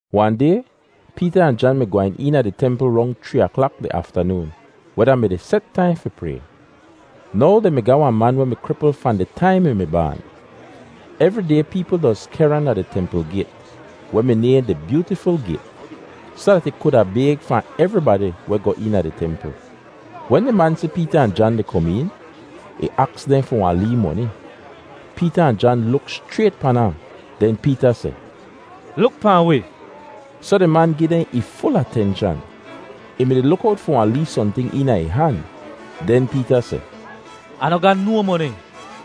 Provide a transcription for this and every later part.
Wahn day, Peeta ahn Jan mi gwehn eena di templ rong chree aklak di aftanoon, weh da mi di set taim fi pray. Now dehn mi ga wahn man weh mi kripl fahn di taim ih mi baan. Evri day peepl doz kehr ahn da di templ gayt, weh mi nayhn di Byootiful Gayt, soh dat ih kuda bayg fahn evribadi weh goh eena di templ. Wen di man si Peeta ahn Jan di kom een, ih aks dehn fi wahn lee moni. Peeta ahn Jan luk schrayt pan ahn. Den Peeta seh, “Luk pahn wi!” Soh di man gi dehn ih ful atenshan. Ih mi-di luk owt fi wahn lee sohnting eena ih han. Den Peeta seh, “Ah noh ga no moni,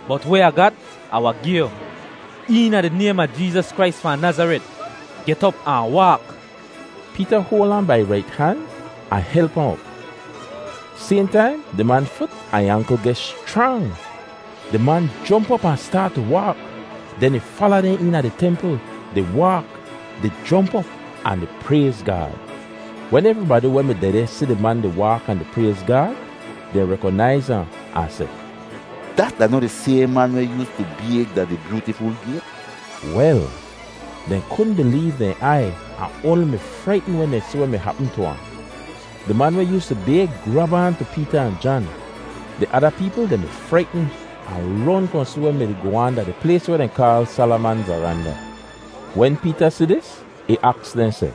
bot weh Ah gat, Ah wahn gi yu. Eena di naym a Jeezas Krais fahn Nazaret, get op ahn waak!” Peeta hoal ahn bai ih rait han ahn help ahn op. Sayhn taim di man fut ahn ih ankl geh schrang. Di man jomp op ahn staat tu waak. Den ih fala dehn eena di templ, di waak, di jomp op, ahn di prayz Gaad. Wen evribadi weh mi dehdeh si di man di waak ahn di prayz Gaad, dehn rekonaiz ahn, ahn seh, “Dat da noh di sayhn man weh yoostu bayg da di Byootiful Gayt?” Wel, dehn kudn bileev dehn aiy ahn oanli mi fraitn wen dehn si weh mi hapm tu ahn. Di man weh yoostu bayg grab aan tu Peeta ahn Jan. Di ada peepl dehn mi fraitn ahn ron kohn si weh mi-di goh aan da di plays weh dehn kaal Salaman Varanda. Wen Peeta si dis, ih aks dehn seh,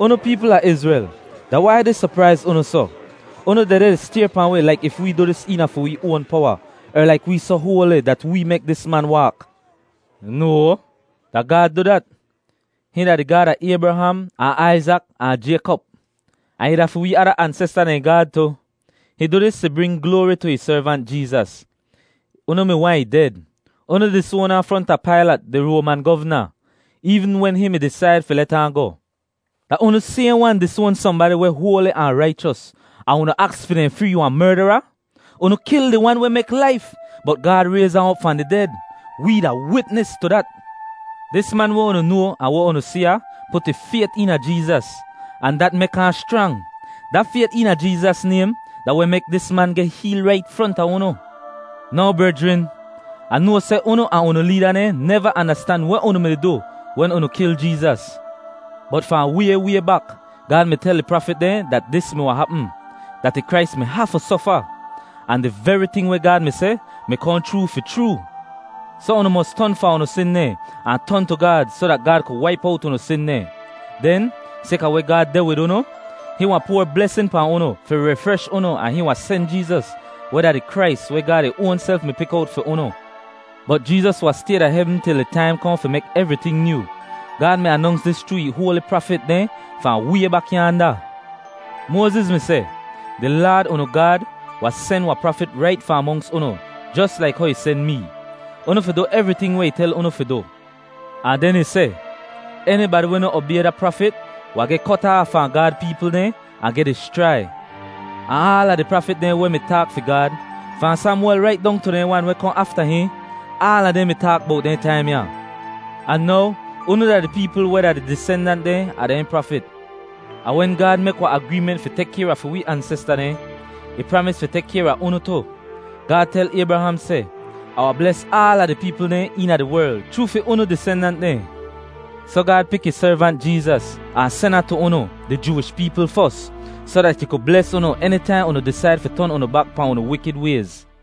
“Unu peepl a Izrel, da wai dis sopraiz unu soh? Unu dehdeh di stayr pahn wi laik if wee du dis eena fi wee oan powa, er laik wee soh hoali dat wee mek dis man waak. No! Da Gaad du dat. Hihn da di Gaad a Aybraham, ahn Aizak ahn Jaykop, ahn ih da fi wee ada ansesta dehn Gaad tu. Hihn du dis fi bring gloari tu ih Servant Jeezas. Unu mi waahn ih ded; unu disoan ahn fronta Pailat, di Roaman govna, eevn wen hihn mi disaid fi let ahn goh. Da unu sayhn wan disoan sohnbadi weh hoali ahn raichos, ahn unu aks fi dehn free wahn merdara. Unu kil di Wan weh mek laif, bot Gaad rayz ahn op fahn di ded. Wee da witnis tu dat. Dis man weh unu noa ahn weh unu si ya put ih fayt eena Jeezas, ahn dat mek ahn schrang. Da fayt eena Jeezas naym da weh mek dis man geh heel rait fronta unu. “Now brejrin, Ah noa seh unu ahn unu leeda dehn neva andastan weh unu mi-di du wen unu kil Jeezas. Bot fahn way way bak Gaad mi tel di prafit dehn dat dis mi wahn hapm, dat ih Krais mi hafu sofa! Ahn di veri ting weh Gaad mi seh mi kohn chroo fi chroo. Soh unu mos ton fahn unu sin dehn ahn ton tu Gaad soh dat Gaad ku waip owt unu sin dehn. Den, sayka weh Gaad deh wid unu, hihn wahn poar blesin pahn unu fi rifresh unu ahn hihn wahn sen Jeezas, weh da di Krais weh Gaad ih oanself mi pik owt fi unu. Bot Jeezas wahn stay da hevn til di taim kohn fi mek evriting nyoo. Gaad mi anonks dis chroo ih hoali prafit dehn fahn way bak yaanda. Moaziz mi seh, ‘Di Laad unu Gaad wahn sen wahn prafit rait fahn monks unu jos laik how ih sen mee. Unu fi du evriting weh ih tel unu fi du.’ Ahn den ih seh, ‘Enibadi weh noh obay da prafit wahn geh kot aaf fahn Gaad peepl dehn ahn geh dischrai.’ “Ahn aala di prafit dehn weh mi taak fi Gaad, fahn Samwel rait dong tu dehn wan weh kohn afta hihn, aala dehn mi taak bowt dehn taim ya. Ahn now unu da di peepl weh da di disendant dehn a dehn prafit. Ahn wen Gaad mek wahn agreement fi tek kayr a fi wi ansesta dehn, ih pramis fi tek kayr a unu tu. Gaad tel Aybraham seh, ‘Ah wahn bles aala di peepl dehn eena di werl chroo fi unu disendant dehn.’ Soh Gaad pik ih Servant Jeezas, ahn sen ahn tu unu, di Jooish peepl fos, soh dat ih ku bles unu enitaihn unu disaid fi ton unu bak pahn unu wikid wayz.”